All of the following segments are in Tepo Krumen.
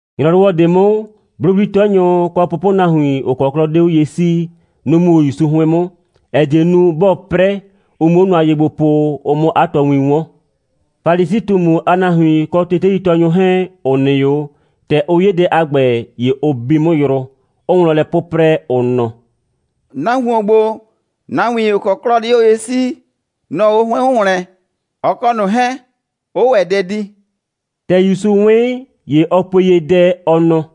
‑Nyrɔwɔ ꞊de 'mʋ, 'blʋwli'tɛnyʋ, kɔ pʋpʋnahuin, ‑ʋ kɔ 'klɔ 'de 'o ye 'sii, nʋ‑ mu 'o ‑Yusu 'hʋɩn 'mʋ, ‑ɛ die nu, 'bɔɔ 'prɛ, ʋ 'muo nʋa ye gbo po, ʋ 'mʋ 'a tɔɔwin 'wɔn. Falisi꞊tumu a nahuin kɔ teteitɔɔnyʋ 'hɛɛn, ‑ʋ nɩ 'o, ‑tɛ ʋ 'ye dɛ a ‑gbɛ, ‑ye ʋ bi 'mʋ yrʋ, 'ʋʋ wlɔn lɛ 'pʋprɛ, ʋ nɔ: «Nahuon ‑gbo, nahuin, ‑ʋ kɔ 'klɔ 'de 'o ye 'sii, nʋ‑ ɔɔ 'o 'hʋɩn 'mʋ ‑wlɛn, ɔ kɔ ꞊nʋ 'hɛɛn 'ʋʋ ‑wɛ dɛ di.» ‑Tɛ ‑Yusu 'wɩn, ‑ye ɔ pue ye dɛ, ɔ nɔ: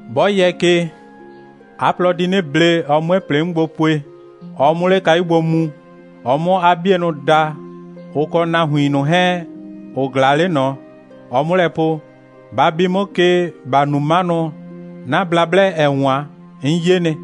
'Bɔ yɛ ke, 'a plɔ di 'nɩ ble, ɔ 'mue ‑plɩ 'mʋ gbo pue, ɔ 'mʋ 'le kayu gbo mu, ɔ 'mʋ 'a 'bienʋ da, ʋ kɔ nahuin ꞊nʋ 'hɛɛn, ‑ʋ ꞊glaa 'le ꞊nɔ, ɔ 'mʋ lɛ po: Ba bi 'mʋ ke, ‑ba nu 'manʋ, 'na blablɛ, ‑ɛ 'wan, 'n 'ye nɩ.»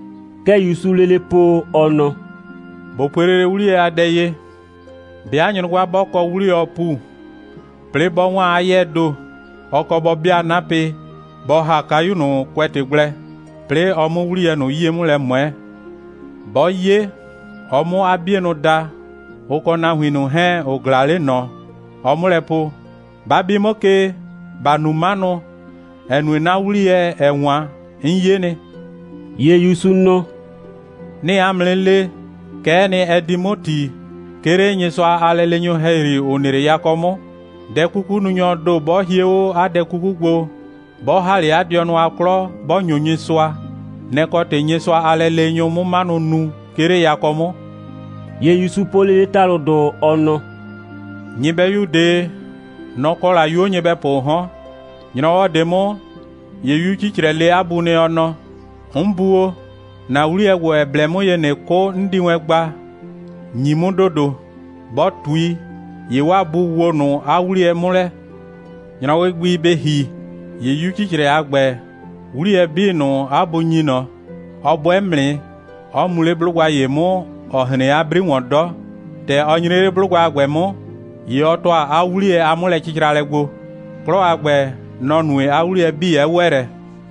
Kɛ ‑Yusuu lele po, ɔ nɔ: «꞊Bo pue lele 'wliyɛ a dɛ ye: 'Bɩa nyrʋgba 'bɔ kɔ 'wliyɔɔ ‑pu, 'plɩɩ 'bɔ 'waan 'a 'yɛɛ ‑do, ɔ kɔ bɔ 'bɩa 'napɩ, bɔ ‑ha kayu ꞊nʋ kʋɛtɩ gblɛ, 'plɩɩ ɔ 'mʋ 'wliyɛ ꞊nʋ 'yie 'mʋ lɛ ꞊mʋɛ. 'Bɔ 'ye, ɔ 'mʋ 'a 'bienʋ da, ʋ kɔ nahuin ꞊nʋ 'hɛɛn, ‑ʋ ꞊glaa 'le ꞊nɔ, ɔ 'mʋ lɛ po: Ba bi 'mʋ ke, ‑ba nu 'manʋ, ‑ɛ nue 'na 'wliyɛ, ‑ɛ 'wan, 'n 'ye nɩ.» ‑Ye ‑Yusu nɔ: «'Nɩɩ 'a mʋ 'nɩ le, kɛ'ɛ nɩ, ɛ di 'mʋ ‑ti, 'ke 'le Nyɩsʋa a lɛleenyʋ ‑hɛyri, ‑ʋ nɩ 'le yakɔ 'mʋ. Dɛ'kukununyɔɔ ‑do 'bɔ hie 'o 'a dɛ 'kuku gbo, 'bɔ ‑ha 'le 'a dɩɔnʋ a 'klɔ, 'bɔ ‑nyo Nyɩsʋa, nɛ‑ kɔ ‑tɩ Nyɩsʋa a lɛleenyʋ 'mʋ 'manʋ nu, 'ke 'le yakɔ 'mʋ.» ‑Ye ‑Yusu po lele ‑talʋdʋ, ɔ nɔ: «Nyɩbɛyu ꞊de, nɔ‑ kɔ la 'yuo nyɩbɛpʋʋ 'hɔn. ‑Nyrɔwɔ ꞊de 'mʋ, ‑ye 'yu 'cicrɛ le 'a bu nɩ, ɔ nɔ: 'N bu o, ‑na 'wliyɛ ‑gbo, ‑ɛ blɛ 'mʋ ye, ꞊nɩ 'kʋ, 'n di wɛn gba, ‑nyi 'mʋ ‑dodo. Bɔ ꞊tui, ‑ye 'waa bu woo ꞊nʋ 'a 'wliyɛ 'mʋ lɛ. ‑Nyrɔwɩ gbi bɩ ‑hi, ‑ye 'yu 'cicrɛ a ‑gbɛ, 'wliyɛ 'bii ꞊nʋ, 'a bu ‑nyi ꞊nɔ, ɔ 'bʋɛ 'mʋ nɩ, 'ɔ mu 'le 'blʋgba ‑ye 'mʋ, ‑ɔ hren 'a 'bri ‑wɔn 'dɔ. ‑Tɛ ɔ nyre 'le 'blʋgba a ‑gbɛ 'mʋ, ‑ye ɔ ‑tʋa 'a 'wliyɛ a 'mʋlɛcɩcralɛ gbo. 'Klɔ a ‑gbɛ, nɔ‑ nue, 'a 'wliyɛ 'bii 'ɛ ‑wɛ lɛ.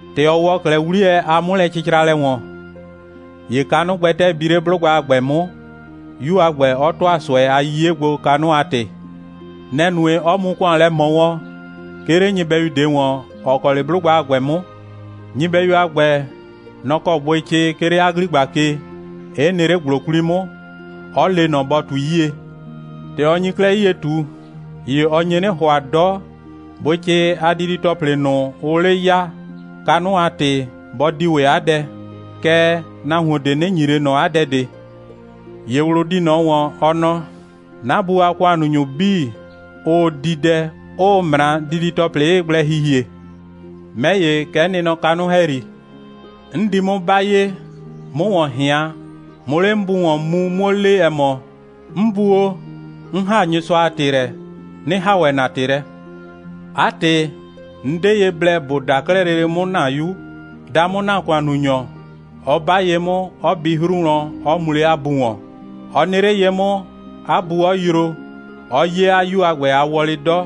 ‑Tɛ ɔ ‑wɔ 'klɛɛ 'wliyɛ a 'mʋlɛcɩcralɛ ‑wɔn, ‑ye kanʋ gbɛtɛɛ bi 'le 'blʋgba a ‑gbɛ 'mʋ, 'yu a ‑gbɛ 'ɔ ‑tʋa ꞊sʋɛ a 'yiye gbo, kanʋ a ‑tɩ. Nɛ‑ nue, 'ɔ mu ‑kʋan lɛ ꞊mɔ wɔn, 'ke 'le nyɩbɛyu ꞊de ‑wɔn, ‑ɔ kɔ 'le 'blʋgba a ‑gbɛ 'mʋ. Nyɩbɛyu a ‑gbɛ, nɔ‑ kɔ bʋɩcɩ, 'ke 'le 'a ‑gligba ke, 'ɩ nɩ 'le ‑gblo 'kwli 'mʋ; 'ɔ le ꞊nɔ, bɔ ꞊tui 'yie. ‑Tɛ ɔ nyi 'klɛɛ 'yie ꞊tu, ‑ye ɔ nye 'nɩ ‑hʋa 'dɔ, bʋɩcɩ a didi‑tɔplɩ ꞊nʋ, ʋʋ 'le ya, kanʋ a ‑tɩ, bɔ di ‑wɛ 'a dɛ, kɛɛ, nahuon ꞊de 'nɩ ‑nyi ꞊le ꞊nɔ 'a dɛ ꞊de. ‑Ye ꞊wlʋ di ꞊nɔ ‑wɔn, ɔ nɔ: 'Na bu a ‑kʋannunyʋ 'bii, ʋʋ di dɛ, 'ʋʋ ꞊mra, didi‑tɔplɩ 'ɩɩ gblɛ hihie. 'Mɛ ‑ye, kɛ 'n nɩ nɔ kanʋ ‑hɛyri. 'N di 'mʋ 'ba ye, 'mʋ ‑wɔn ꞊hɩan, 'mʋ 'le 'n bu ‑wɔn mu, 'muo le, ‑ɛ mɔ: 'N bu o, 'n ‑haa Nyɩsʋa a ‑tɩ lɛ, 'nɩ ‑haa ‑wɛ ‑na ‑tɩ lɛ. 'A ‑tɩ, 'n 'de ye blɛ ‑bo daa 'klɛɛ lele 'mʋ ‑na 'yu. Daa 'mʋ ‑na ‑kʋannunyɔ, 'ɔ 'ba ye 'mʋ, 'ɔ bi 'hru wlɔn, 'ɔ mu 'le 'a bu ‑wɔn. Ɔ nɩ 'le ye 'mʋ, 'a bu 'ɔ yroo, 'ɔ 'ye 'a 'yu a ‑gbɛ a wɔlɩ 'dɔ,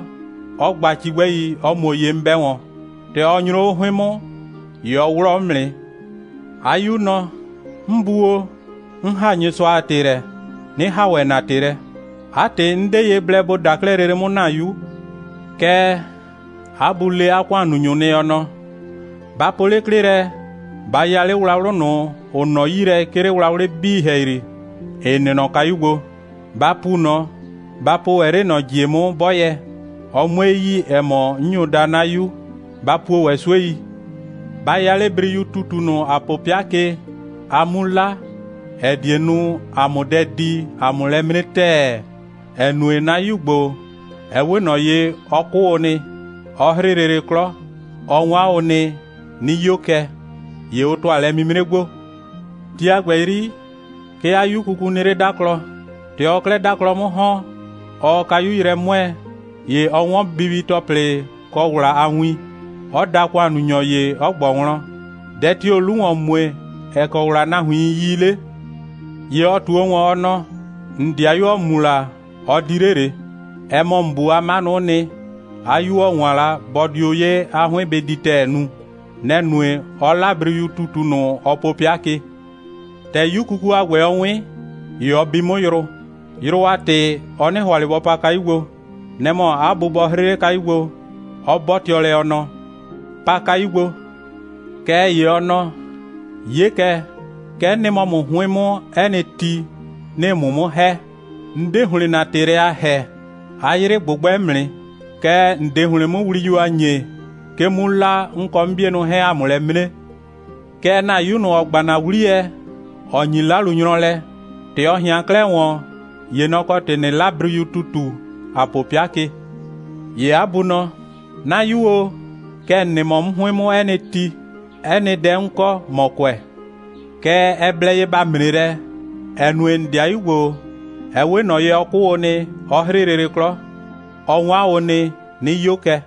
'ɔ gba cigbɛi, 'ɔ muo ye 'mʋ 'bɛ wɔn. ‑Tɛ ɔ nyro 'o 'hʋɩn 'mʋ, ‑ye ɔ 'wlɔɔ 'mʋ nɩ. 'A 'yu nɔ: 'N bu o, 'n ‑haa Nyɩsʋa a ‑tɩ lɛ, 'nɩ ‑haa ‑wɛ ‑na ‑tɩ lɛ. 'A ‑tɩ, 'n 'de ye blɛ ‑bo daa 'klɛɛ lele 'mʋ ‑na 'yu. Kɛɛ, 'a bu le 'a ‑kʋannunyʋ nɩ, ɔ nɔ: Ba po 'le 'klɩ lɛ, ba ya 'le wlawlʋ ꞊nʋ, ‑ʋ nɔ 'yi lɛ, 'ke 'le wlawlɩ 'bii ‑hɛyri, ‑ɩ nɩ nɔ kayu gbo. Ba pu ꞊nɔ. Ba po ‑wɛ 'le ꞊nɔ ‑jie 'mʋ 'bɔyɛ, (ɔ 'mue yi, ‑ɛ mɔ, 'n nyo daa 'na 'yu.) Ba puo ‑wɛ 'suei. Ba ya 'le briyu ‑tutu ꞊nʋ, ‑a po 'pɩa ke, a 'mu 'la, ‑ɛ die nu, ‑a 'mʋ dɛ di, ‑a 'mʋ lɛ 'mre ‑tɛɛ, ‑ɛ nue, 'na 'yu ‑gbo, ɛ 'we ꞊nɔ ye, ɔ 'kʋ o nɩ, 'ɔ 'hrɩ lele 'klɔ. Ɔ 'wan o nɩ, 'nɩ 'yo kɛ. ‑Ye ʋ ‑tʋa lɛ'mimre gbo. Ti a ‑gbɛ 'yri, 'ke 'a 'yu kuku nɩ 'le 'daklɔ. ‑Tɛ ɔɔ 'klɛɛ 'daklɔ 'mʋ ‑hɔn, ɔɔ kayu yrɛ 'mʋɛɛ, ‑ye ɔ 'wɔn bibi‑tɔplɩ kɔ ‑wla a win, 'ɔ da ‑kʋannunyɔ ‑ye, 'ɔ ꞊gbɔ wlɔn: Dɛ tio‑o 'lu ‑wɔn mue, ‑ɛ kɔ ‑wla nahuiin yi 'le? ‑Ye ɔ ꞊tuo ‑wɔn, ɔ nɔ: ‑N ‑dɩayu, ‑ɔ mu la, ɔ di 'le ꞊le. Ɛ mɔ ‑n bu a 'manʋ'ʋ nɩ, 'a 'yu, ‑ɔ 'wan la, bɔ dio 'ye, 'a 'hʋɩn bɩ di ‑tɛɛ nu. Nɛ‑ nue, 'ɔ 'la briyu ‑tutu ꞊nʋ, ɔ po 'pɩa ke. ‑Tɛ 'yu kuku a ‑gbɛ, ɔ 'wɩn, ‑ye ɔ bi 'mʋ yrʋ. Yrʋ a ‑tɩ, ɔ 'nɩ ‑hʋa ꞊le bɔ pa kayu gbo. Nɛ‑ mɔ 'a bu bɔ 'hrɩ 'le kayu gbo, 'ɔ 'bɔtɩɔ lɛ, ɔ nɔ: Pa kayu gbo. Kɛɛ ‑ye ɔ nɔ: 'Ye kɛ, kɛ 'n nɩ mɔ ‑mʋ 'hʋɩn 'mʋ 'ɛ nɩ ti, 'nɩɩ ‑mʋ 'mʋ ‑hɛ. 'N 'de ‑hlɩn ‑na ‑tɩ lɛ a ‑hɛɛ, 'a 'yrɩ ꞊gbʋgbɛ 'mʋ nɩ. Kɛɛ, ‑n 'de ‑hlɩn 'mʋ wliyu a ‑nyee, 'ke 'mu 'la, 'n kɔ 'n 'bienʋ 'hɛɛn, ‑a 'mʋ lɛ 'mre. Kɛɛ, ‑na 'yu ꞊nʋ, ‑ɔ gba ‑na 'wliyɛ, ‑ɔ ‑nyi 'lalunyrʋ lɛ, ‑tɛ ɔ ꞊hɩan 'klɛɛ ‑wɔn, ‑ye nɔ‑ kɔ ‑tɩ, ꞊nɩ 'la briyu ‑tutu, ‑a po 'pɩa ke. ‑Ye 'a bu nɔ: 'Na 'yu o, kɛ ‑n nɩ mɔ 'mʋ 'hʋɩn 'mʋ 'ɛ nɩ ti. 'Ɛ nɩ dɛ 'n kɔ, ‑mɔ kʋɛ. Kɛɛ, ɛ blɛ ye ‑ba 'mre lɛ, ‑ɛ nue, ‑n ‑dɩayu ‑gbo, ɛ 'we ꞊nɔ ye, ɔ 'kʋ o nɩ, 'ɔ 'hrɩ lele 'klɔ. Ɔ 'wan o nɩ, 'nɩ 'yo kɛ.»